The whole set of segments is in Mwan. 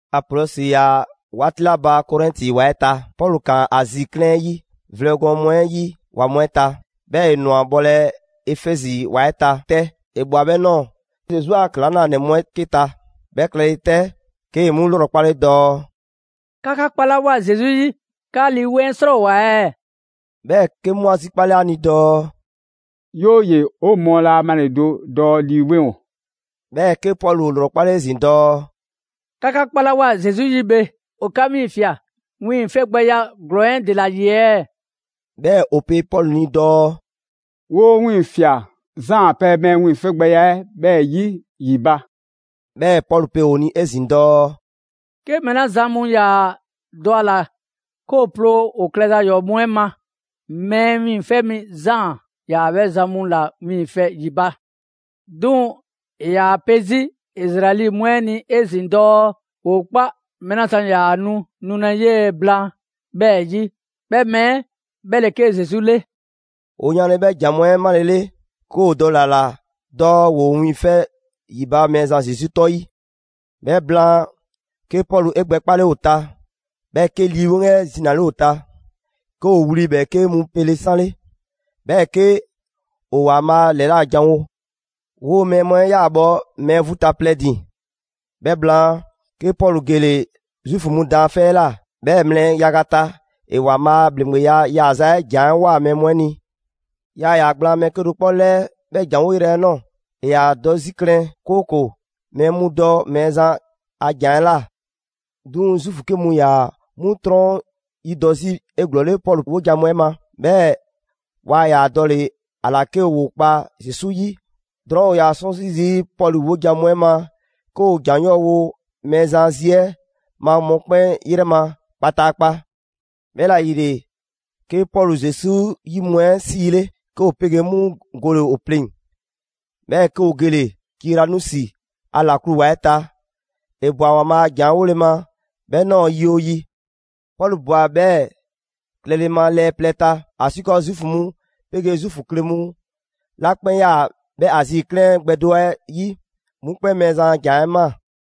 Apolɔsi ‑yaa 'waati 'la ba Korɛnti ‑wa 'ɛ ta, Pɔlu ꞊kaan Azi 'klɛɛn 'ɛ 'yi vlɛ gɔɔn mu 'ɛ 'yi ‑wa mu 'ɛ ta, 'bhɛɛ‑ ‑e ꞊nwa bhɔlɛ Efɛzi ‑wa 'ɛ ta 'tɛ. ‑E ꞊bhwa 'bhɛ ꞊nɔɔ Zesu a ‑klaŋlanɛ mu 'ɛ 'ke ta. 'Bhɛ klɛle 'tɛ, 'kee‑ 'mu 'lrɔkpale dɔɔ: «'Ka 'ka 'kpalawoa Zesu 'yi, 'ka Lii 'Weŋ 'ɛ 'srɔɔwoa‑ ɛɛ?» 'Bhɛɛ‑ 'ke 'mu 'a zikpale ‑a ni dɔɔ: «'Yooye‑, 'o mɔɔ laa a malɛ ‑lido' dɔɔ Lii 'Weŋ ‑o.» 'Bhɛɛ‑ 'ke Pɔlu ‑o ‑lrɔkpale 'ezin‑ dɔɔ: «'Ka 'ka 'kpalawoa Zesu 'yi bhe, ‑o 'ka 'wiiŋfia꞊ wiiŋfɛgbɛya ‑glɔɔn 'ɛ ‑dela ‑yi ɛɛ?» 'Bhɛɛ‑ ‑o pe Pɔlu ni dɔɔ: «‑Woo' 'wiiŋfia꞊ Zaan a pɛ mɛɛ wiiŋfɛgbɛya 'bhɛɛ‑ 'yi ‑yi ba.» 'Bhɛɛ‑ Pɔlu pe ‑o ni 'ezin‑ dɔɔ: «'Ke mɛɛ 'la zan mu ‑yaa dɔ a ‑la 'ke ‑o ploo ‑o klɛza ‑yɔɔ' mu 'ɛ ma, Mɛɛ Wiiŋfɛ' Mi Zaan ‑yaa 'bhɛ zan mu ‑la wiiŋfɛ ‑yi ba. 'Duŋ‑ ‑e ‑yaa pe 'zi Izraɛli mu 'ɛ ni 'ezin‑ dɔɔ ‑woo 'kpa mɛɛ 'la zan ‑yaa nu nulɛ 'yee‑ blaan, 'bhɛɛ‑ 'yi; 'bhɛ mɛɛ 'ɛ 'bhɛ ‑le 'ke Zesu 'le.» ‑O yanle 'bhɛ ‑jan mu 'ɛ 'malele, 'ke ‑o dɔle‑ ‑a ‑la dɔɔ ‑woo wiiŋfɛ' ‑yi ba Mɛɛzan Zesu 'tɔ 'ɛ 'yi. 'Bhɛ blaan, 'ke Pɔlu 'e gbɛ 'kpale ‑o ta, 'bhɛɛ‑ 'ke Lii 'Weŋ 'ɛ zinale ‑o ta. 'Ke ‑o wli ‑bhɛɛke' mu 'pele 'sanle, 'bhɛɛ‑ 'ke ‑o ‑Waanbhaa' ‑lɛla' janwo. 'Woo‑ mɛɛ mu 'ɛ 'yaa‑ bhɔ mɛɛ vu ta plɛ ‑din. 'Bhɛ blaan, 'ke Pɔlu gele‑ Zuufu mu daanfɛ' 'ɛ ꞊la. 'Bhɛɛ‑ mlɛ yaga ta, ‑e ‑Waanbhaa' a ‑bhleŋgbeya yaaza 'ɛ ‑jan 'ɛ ꞊woa mɛɛ mu ni. Yaa ‑yaa gblaan mɛɛ 'kedo‑ 'kpɔ 'lɛɛ 'bhɛ ‑janwo' yrɛ 'ɛ ꞊nɔɔ. ‑E ‑yaa dɔ 'zi klɛn, 'kooko‑ mɛɛ mu dɔ Mɛɛzan a ‑jan 'ɛ ꞊la. 'Duŋ‑ Zuufu 'ke mu ‑yaa 'mu 'trɔn 'yi dɔ 'zi 'eglɔɔle Pɔlu 'wojan‑ mu 'ɛ ma, 'bhɛɛ‑ waa ‑yaa dɔle‑ ‑a ‑la 'ke ‑woo kpa Zesu 'yi. Drɔɔn', ‑o ‑yaa 'sɔnsi zii' Pɔlu 'wojan‑ mu 'ɛ ma 'ke ‑o ‑jan 'yɔɔ‑ wo Mɛɛzan a zi 'ɛ ma mɔkpɛn' 'yrɛ ma kpataakpa. 'Bhɛla‑ ‑yile 'ke Pɔlu Zesu 'yi mu 'ɛ 'siile, 'ke ‑o 'pegee 'mu gole‑ ‑o pleŋ‑, 'bhɛɛ‑ 'ke ‑o gele‑ Tiranusi ‑a ‑laklu ‑wa 'ɛ ta. ‑E ꞊bwa ‑Waanbhaa' a ‑janwo' 'ɛ 'wole‑ ma 'bhɛ ꞊nɔɔ yi 'oo yi. Pɔlu ꞊bwa 'bhɛɛ‑ klɛle ma lɛɛ plɛ ta, ‑asiikɔɔ Zuufu mu 'pegee Zuufu kle mu 'la 'kpɛn 'yaa‑ 'bhɛ Azi 'klɛɛn gbɛ do 'ɛ 'yi, 'mu 'kpɛn Mɛɛzan a ‑jan 'ɛ ꞊maa.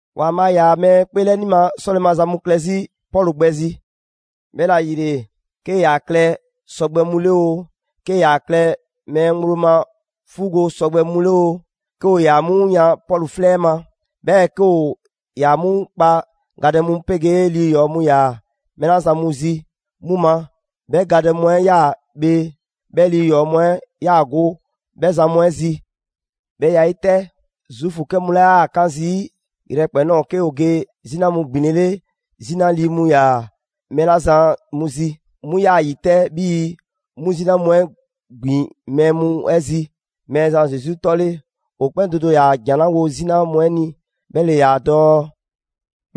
‑Waanbhaa' ‑yaa mɛɛ 'kpeelɛni ma 'sɔle‑ maza mu klɛ 'zi Pɔlu gbɛ zi. 'Bhɛla‑ ‑yile, 'kee‑ ‑yaa klɛ sɔgbɛ mu 'le oo, 'kee‑ ‑yaa klɛ mɛɛ ŋgblo ma 'fuugo‑ sɔgbɛ mu 'le oo, 'ke ‑o ‑yaa 'mu yan Pɔlu 'flɛ 'ɛ ma, 'bhɛɛ‑ 'ke ‑o ‑yaa 'mu kpa gadɛ mu 'pegee lii ‑yɔɔ mu ‑yaa mɛɛ 'la zan mu zi 'mu ma, 'bhɛ gadɛ mu 'ɛ ꞊yaa bhee, 'bhɛɛ‑ lii ‑yɔɔ' mu 'ɛ ꞊yaa go 'bhɛ zan mu 'ɛ zi. 'Bhɛ ya 'ɛ 'yi 'tɛ, Zuufu 'kɛ mu 'la 'yaa‑ 'kaan zii' yrɛkpɛn‑ ꞊nɔɔ 'ke ‑o ge 'zina mu ‑gbinlele 'zina lii mu ‑yaa mɛɛ 'la zan mu zi, 'mu ꞊yaa zi 'tɛ 'bhii‑ 'mu 'zina mu 'ɛ ‑gbin mɛɛ mu 'ɛ zi Mɛɛzan Zesu 'tɔ 'ɛ 'le. ‑O 'kpɛn do do ‑yaa ‑jan 'la wo 'zina mu 'ɛ ni, 'bhɛ ‑le ‑yaa dɔɔ: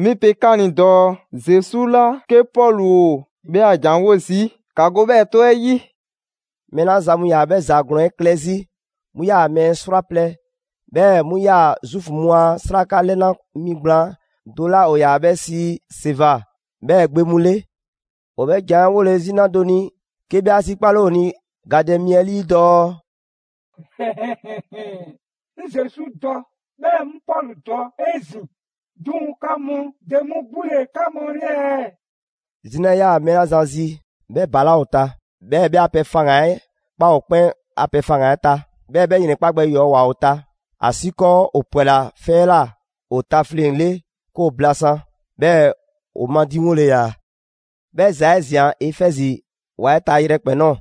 «'Mi pe 'ka ni dɔɔ Zesu 'la 'ke Pɔlu ‑o 'bhɛ a ‑jan 'wo zii', ‑ka go 'bhɛɛ‑ 'tɔ 'ɛ 'yi!» Mɛɛ 'la zan mu ‑yaa 'bhɛ ‑za ‑glɔɔn 'ɛ klɛ 'zi, 'mu 'yaa‑ mɛɛ 'srwaplɛ‑, 'bhɛɛ‑ 'mu ‑yaa Zuufu mu a 'sraka 'lɛna‑ mi gblaan do 'la ‑o ‑yaa 'bhɛ sii Seva 'bhɛɛ‑ gbe mu 'le. ‑O 'bhɛ ‑jan 'ɛ 'wole‑ 'zina do ni, 'ke 'bhɛ 'a zikpale ‑o ni gadɛ mi 'ɛ 'lii dɔɔ: «'Ŋ Zesu dɔ, 'bhɛɛ‑ 'ŋ Pɔlu dɔ 'ezin‑; 'duŋ‑ 'ka mu, ‑de mu 'gbu ‑le 'ka mu 'le ɛɛ?» 'Zina ꞊yaa mɛɛ 'la zan zi, 'bhɛ ‑balaa' ‑o ta, 'bhɛɛ‑ 'bhɛ a pɛ faŋgan‑ 'ɛ ꞊kpaa ‑o 'kpɛn a pɛ faŋgan‑ 'ɛ ta; 'bhɛɛ‑ 'bhɛ ‑yrɛnkpa' gbɛ ‑yɔɔ' ꞊woa ‑o ta, ‑asiikɔɔ ‑o ‑pwɛla 'fɛ 'ɛ ꞊la ‑o tafleŋ‑ 'le 'ke ‑o blasaan‑, 'bhɛɛ‑ ‑o madiŋwole ‑yaa. 'Bhɛ ‑za 'ɛ ꞊zian Efɛzi ‑wa 'ɛ ta yrɛkpɛn‑ ꞊nɔɔ.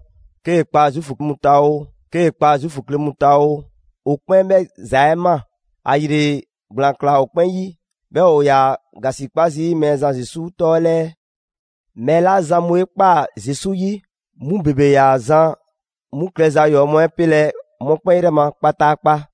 'Kee‑ kpa Zuufu mu ta oo, 'kee‑ kpa Zuufu kle mu ta oo, 'o 'kpɛn 'bhɛ ‑za 'ɛ ꞊maa; ‑ayile ‑gblaan ꞊klaa ‑o 'kpɛn 'yi, 'bhɛɛ‑ ‑o ‑yaa ‑gasikpa zii' Mɛɛzan Zesu 'tɔ 'ɛ 'lɛɛ. Mɛɛ 'la zan 'mu 'e ꞊kpaa Zesu 'yi, 'mu ‑bebe ‑yaa zan 'mu klɛza ‑yɔɔ' mu 'ɛ 'pelɛ‑ mɔkpɛn' 'yrɛ ma kpataakpa.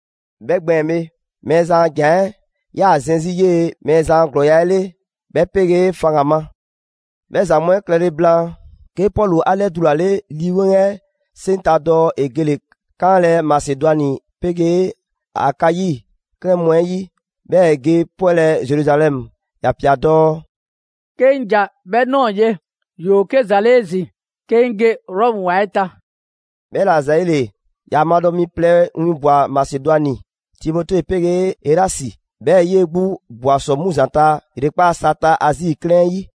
'Bhɛ gbɛɛn‑ bhe, Mɛɛzan a ‑Jan 'ɛ 'yaa‑ zɛn 'zi 'yee‑ Mɛɛzan a ‑glɔɔya' 'ɛ 'le, 'bhɛ 'pegee faŋgan‑ ma. 'Bhɛ ‑za mu 'ɛ klɛle blaan, 'ke Pɔlu 'a 'lɛdulale Lii 'Weŋ 'ɛ 'seŋ ta dɔɔ ‑e gele‑ 'kanlɛ‑ Masedwani 'pegee Akayi 'klɛɛn mu 'ɛ 'yi, 'bhɛɛ‑ ‑e ge 'pwɛlɛ‑ Zeruzalɛmu. ‑Ya ꞊pia dɔɔ: «'Ke 'ŋ ‑ja 'bhɛ ꞊nɔɔ ye, ‑yoo 'ke ‑za 'le 'ezin‑ 'ke 'ŋ ge Rɔmu ‑wa 'ɛ ta.» 'Bhɛla‑ ‑zayile, ‑ya madɔ mi plɛ winbwa‑ Masedwani: Timote 'pegee Erasi. 'Bhɛɛ‑ 'yee‑ 'gbu ꞊bwa ‑sɔ 'mu ‑zanta ‑yrekpaa' sa ta Azi 'klɛɛn 'ɛ 'yi.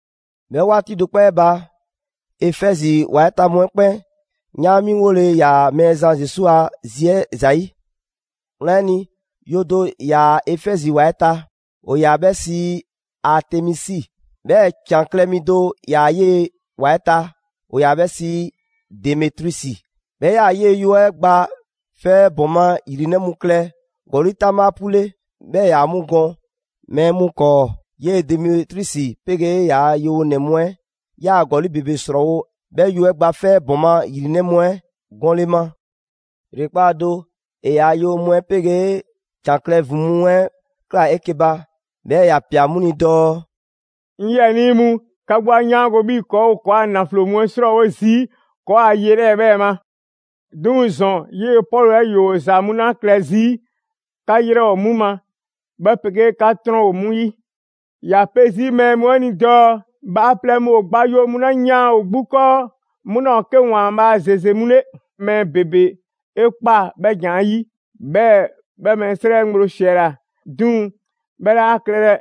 'Bhɛ 'waati do 'kpɔ 'ɛ ba, Efɛzi ‑wa 'ɛ ta mu 'ɛ 'kpɛn 'yaanmiŋwole ‑yaa Mɛɛzan Zesu a zi 'ɛ ‑zayi'. Wlan 'ɛ ni, yo do ‑yaa Efɛzi ‑wa 'ɛ ta. ‑O ‑yaa 'bhɛ sii Aatemisi. 'Bhɛɛ‑ ‑can klɛ mi do ‑yaa 'yee‑ ‑wa 'ɛ ta, ‑o ‑yaa 'bhɛ sii Demetriusi. 'Bhɛ 'yaa‑ 'yee‑ yo 'ɛ gba 'fɛ 'ɛ bhɔɔma ‑yrinɛ' mu klɛ ‑gɔli' 'taŋbha 'pu 'le, 'bhɛɛ‑ ‑e ‑yaa 'mu gɔn mɛɛ mu 'kɔɔ. 'Yee‑ Demetriusi 'pegee ‑yaa' yewonɛ mu 'ɛ ꞊yaa ‑gɔli' ‑bebe 'srɔɔwo 'bhɛ yo 'ɛ gba 'fɛ 'ɛ bhɔɔma ‑yrinɛ' mu 'ɛ gɔnle ma. ‑Yrekpaa' do, ‑e ‑yaa' yewonɛ mu 'ɛ 'pegee ‑can klɛ mu ‑vin mu 'ɛ ꞊klaa 'eke‑ ba, 'bhɛɛ‑ ‑ya ꞊pia 'mu ni dɔɔ: «'Ŋ 'yiɛnii mu, 'ka 'gbu 'a 'yaango‑ 'bhii‑ ‑kɔɔ' ‑o ‑kɔɔa' ‑naflo mu 'ɛ 'srɔɔwo zii' ‑kɔɔa' ye 'lɛɛ‑ 'bhɛɛ‑ ma. 'Duŋ‑ ‑zɔn 'yee‑ Pɔlu 'ɛ ‑yoo ‑za mu 'la klɛ 'zi, 'ka 'yrɛ ‑o 'mu ma, 'bhɛ 'pegee 'ka 'trɔn ‑o 'mu 'yi. ‑Ya pe 'zi mɛɛ mu 'ɛ ni dɔɔ: Bhaaplɛŋ mu ‑o gba yo mu 'la yaan ‑o 'gbu 'kɔɔ, 'mu 'laa ‑o 'ke ‑waanbhaa' ‑zeze mu 'le. Mɛɛ ‑bebe 'e ꞊kpaa 'bhɛ ‑jan 'ɛ yi; 'bhɛɛ‑, 'bhɛ mɛɛ 'srɛ ŋgblo ‑siɛla. 'Duŋ‑ 'bhɛ 'laa klɛlɛ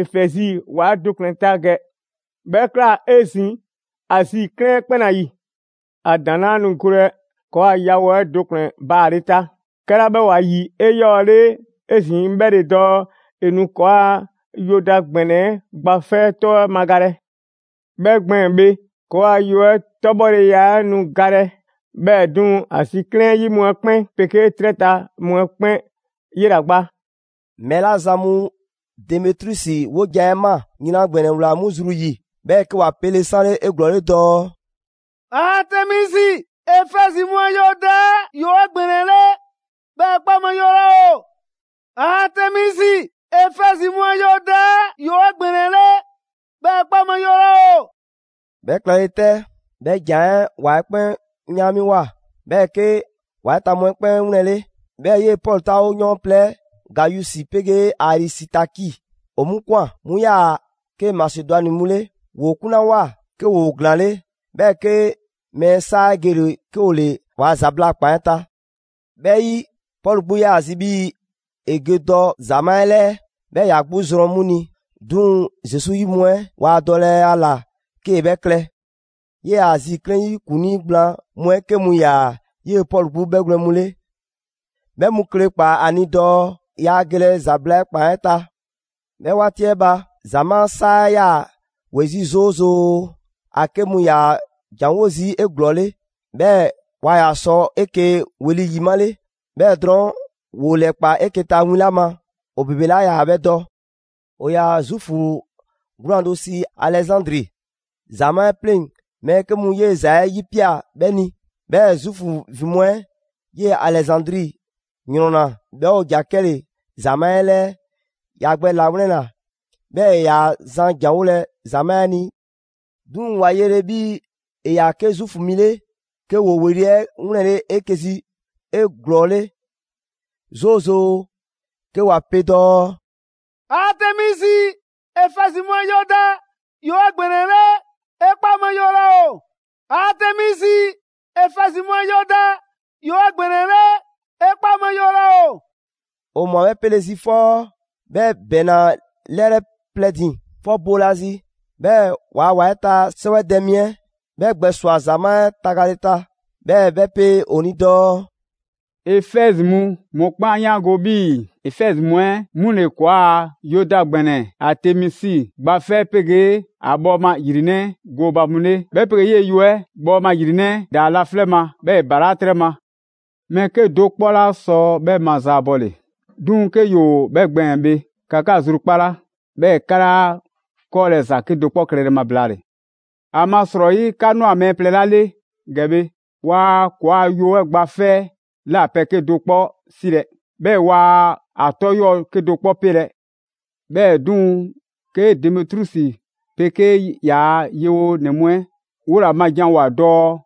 Efɛzi ‑wa do ‑kplɛn ta ‑gɛ, 'bhɛ ꞊kla 'ezin‑ Azi 'klɛɛn 'kpɛn ‑la ‑yi. ‑A ‑daŋ' 'laa nu golɛ ‑kɔɔa' yawo 'ɛ do ‑kplɛn baale ta. 'Kɛla 'bhɛ ‑o ‑a ‑yi 'eyɔɔle 'ezin‑, 'bhɛ ‑le dɔɔ ‑e nu ‑kɔɔa' yo da ‑gbɛnɛ 'ɛ gba 'fɛ 'tɔ 'ɛ magalɛ. 'Bhɛ gbɛɛn‑ bhe, ‑kɔɔa' yo 'ɛ 'tɔbhɔleya 'ɛ nu galɛ; 'bhɛɛ‑ 'duŋ‑ Azi 'klɛɛn 'yi mu 'ɛ 'kpɛn 'pegee 'trɛ ta mu 'ɛ 'kpɛn 'yela‑ gba!» Mɛɛ 'la zan mu Demetriusi 'wojan‑ 'ɛ ꞊maa, yran ‑gbɛnɛ ꞊wlaa 'mu zru 'yi. 'Bhɛɛ‑ 'ke ‑wa pele 'sanle 'eglɔɔle dɔɔ: «Aatemisi, Efɛzi mu a yo da 'ɛ ‑yoo 'egbɛnɛle, 'bhɛɛ‑ 'e 'kpa ma yo laa ‑o! Aatemisi, Efɛzi mu a yo da 'ɛ, 'yoo‑ 'egbɛnɛle, 'bhɛɛ‑ 'e 'kpa yo laa ‑o!» 'Bhɛ klɛle 'tɛ, 'bhɛ ‑jan 'ɛ ‑wa 'ɛ 'kpɛn 'yaanmiŋwoa, 'bhɛɛ‑ 'ke ‑wa 'ɛ ta mu 'ɛ 'kpɛn 'wlɛnle. 'Bhɛɛ‑ 'yee‑ Pɔlu 'taawoyɔɔn plɛ 'ɛ, Gayusi 'pegee Arisitaki, ‑o 'mu ꞊kwan. 'Mu ꞊yaa 'ke Masedwani mu 'le. ‑Woo 'kunlawoa, 'ke ‑woo ‑glaanle', 'bhɛɛ‑ 'ke mɛɛ 'saa 'ɛ gele‑ 'ke ‑o ‑le ‑waa' ‑zabla' ‑kpan 'ɛ ta. 'Bhɛ 'yi, Pɔlu 'gbu 'yaa‑ zi 'bhii‑ ‑e ge dɔ ‑zamaa' 'ɛ 'lɛɛ 'bhɛɛ‑ ‑ya 'gbu zrɔn 'mu ni, 'duŋ‑ Zesu 'yi mu 'ɛ waa dɔlɛ a ‑la 'kee‑ 'bhɛ klɛ. 'Yee‑ Azi 'klɛɛn 'yi ‑kuŋlii gblaan mu 'ɛ 'ke mu ‑yaa 'yee‑ Pɔlu 'gbu 'bhɛgwlɛn‑ mu 'le. 'Bhɛ mu kle ꞊kpaa ‑a ni dɔɔ yaa gelɛ ‑zabla' ‑kpan 'ɛ ta. 'Bhɛ 'waati 'ɛ ba, ‑zamaa' 'saa 'ɛ 'yaa‑ ‑we 'zi 'zoozoo‑: ‑a 'ke mu ‑yaa ‑janwo' zii' 'eglɔɔle, 'bhɛɛ‑ waa ‑yaa sɔ 'eke‑ ‑weli' ‑yi 'male. 'Bhɛɛ‑ drɔɔn', ‑woo ‑lɛkpaa 'eke‑ ta win 'la ma, ‑o ‑bebe 'laa ‑yaa 'bhɛ dɔ. ‑O ‑yaa Zuufu 'gwlaan‑ do sii Alɛzandri. ‑Zamaa' 'ɛ 'pleŋ‑ mɛɛ 'ke mu 'yee‑ ‑za 'ɛ 'yipia꞊ 'bhɛ ni. 'Bhɛɛ‑ Zuufu ‑vin mu 'ɛ 'yee‑ Alɛzandri 'yrɔnna‑, 'bhɛɛ‑ ‑o ‑ja 'kɛle‑ ‑zamaa' 'ɛ 'lɛɛ‑. ‑Ya gbɛ ‑lawlɛnna, 'bhɛɛ‑ ‑e ‑yaa zan ‑janwolɛ ‑zamaa' 'ɛ ni. 'Duŋ‑ ‑wa yele 'bhii‑ ‑e ‑yaa 'ke Zuufu mi 'le, 'ke ‑woo ‑weli' 'ɛ 'wlɛnle 'eke‑ zi 'eglɔɔle 'zoozoo‑ 'ke ‑wa pe dɔɔ: «Aatemisi, Efɛzi mu a yo da, 'yoo‑ 'egbɛnɛle, 'e 'kpa ma yo laa ‑o! Aatemisi, Efɛzi mu a yo da, 'yoo 'egbɛnɛle, 'e 'kpa ma yo laa ‑o!» ‑O ꞊mwa 'bhɛ 'pele‑ zi 'fɔ 'bhɛ ‑bɛɛnna 'lɛrɛ plɛ ‑din. 'Fɔ boolazi, 'bhɛɛ‑ ‑waa' ‑wa 'ɛ ta 'sɛwɛdɛ mi 'ɛ 'bhɛ gbɛswa‑ ‑zamaa' 'ɛ tagale ta; 'bhɛɛ‑ 'bhɛ pe ‑o ni dɔɔ: «Efɛzi mu, mɔkpɛn' 'a 'yaango‑ 'bhii‑ Efɛzi mu 'ɛ 'mu ‑le ‑kɔɔa' yo da ‑gbɛnɛ Aatemisi gba 'fɛ 'pegee ‑a bhɔɔma ‑yrinɛ' 'ɛ gooba mu 'le, 'bhɛ 'pegee 'yee‑ yo 'ɛ bhɔɔma ‑yrinɛ' 'ɛ ‑daa laflɛ' ma, 'bhɛɛ‑ ‑e ‑balaa' 'trɛ ma. Mɛɛ 'kedo‑ 'kpɔ 'laa sɔ 'bhɛ ma zaabɔle. 'Duŋ‑ 'ke ‑yoo 'bhɛ gbɛɛn‑ bhe, ‑ka 'ka zrukpala, 'bhɛɛ‑ 'ka 'laa 'kɔɔlɛ‑ ‑za 'kedo‑ 'kpɔ klɛlɛ ma blaale‑. ‑Amasrɔyi, 'ka ꞊nwa mɛɛ plɛ 'la 'le ‑gɛ bhe, waa ‑kɔɔa' yo 'ɛ gba 'fɛ 'ɛ ꞊la pɛ 'kedo‑ 'kpɔ 'silɛ‑, 'bhɛɛ‑ waa a 'tɔ 'yɔɔ‑ 'kedo‑ 'kpɔ 'pelɛ‑. 'Bhɛɛ‑ 'duŋ‑, 'ke Demetriusi 'pegee ‑yaa' yewonɛ mu 'ɛ ‑woo ‑la ma janwoa‑ dɔɔ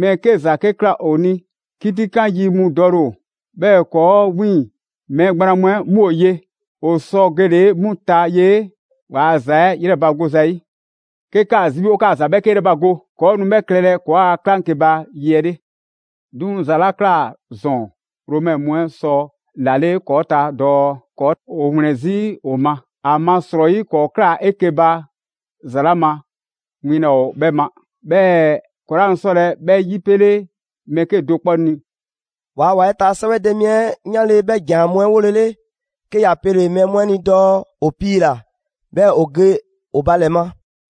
mɛɛ 'ke ‑za 'ke ꞊kla ‑o ni, 'kitikan yi mu dɔle ‑o, 'bhɛɛ‑ ‑kɔɔ' 'wiiŋ‑ mɛɛ gblaan mu 'ɛ 'mu ‑o ye. ‑O sɔ gele‑ 'mu ta ye waa ‑za 'ɛ 'yrɛbago zayi'. 'Ke 'kaa‑ zi 'bhii‑ 'o 'kaa‑ ‑za 'bhɛɛke 'yrɛbago, ‑kɔɔ' nu 'bhɛ klɛlɛ ‑kɔɔ' a 'klaŋkeba yi 'ɛ 'le. 'Duŋ‑ ‑za 'la ꞊kla ‑zɔn, Romɛ mu 'ɛ sɔ ‑lale' ‑kɔɔ' ta dɔɔ ‑kɔɔ' ‑o ‑wlɛn 'zi ‑o ma. ‑Amasrɔyi ‑kɔɔ' ꞊klaa 'eke‑ ba, ‑za 'la ma, win laa ‑o 'bhɛ ma, 'bhɛɛ‑ ‑kɔɔ' 'laa nu 'sɔlɛ‑ 'bhɛ 'yipele mɛɛ 'kedo‑ 'kpɔ ni.» Waa ‑wa 'ɛ ta 'sɛwɛdɛ mi 'ɛ 'yanle 'bhɛ ‑jan mu 'ɛ 'wolele, 'ke ‑ya pele‑ mɛɛ mu 'ɛ ni dɔɔ ‑o piila‑, 'bhɛɛ‑ ‑o ge ‑o ba ‑lɛ ma.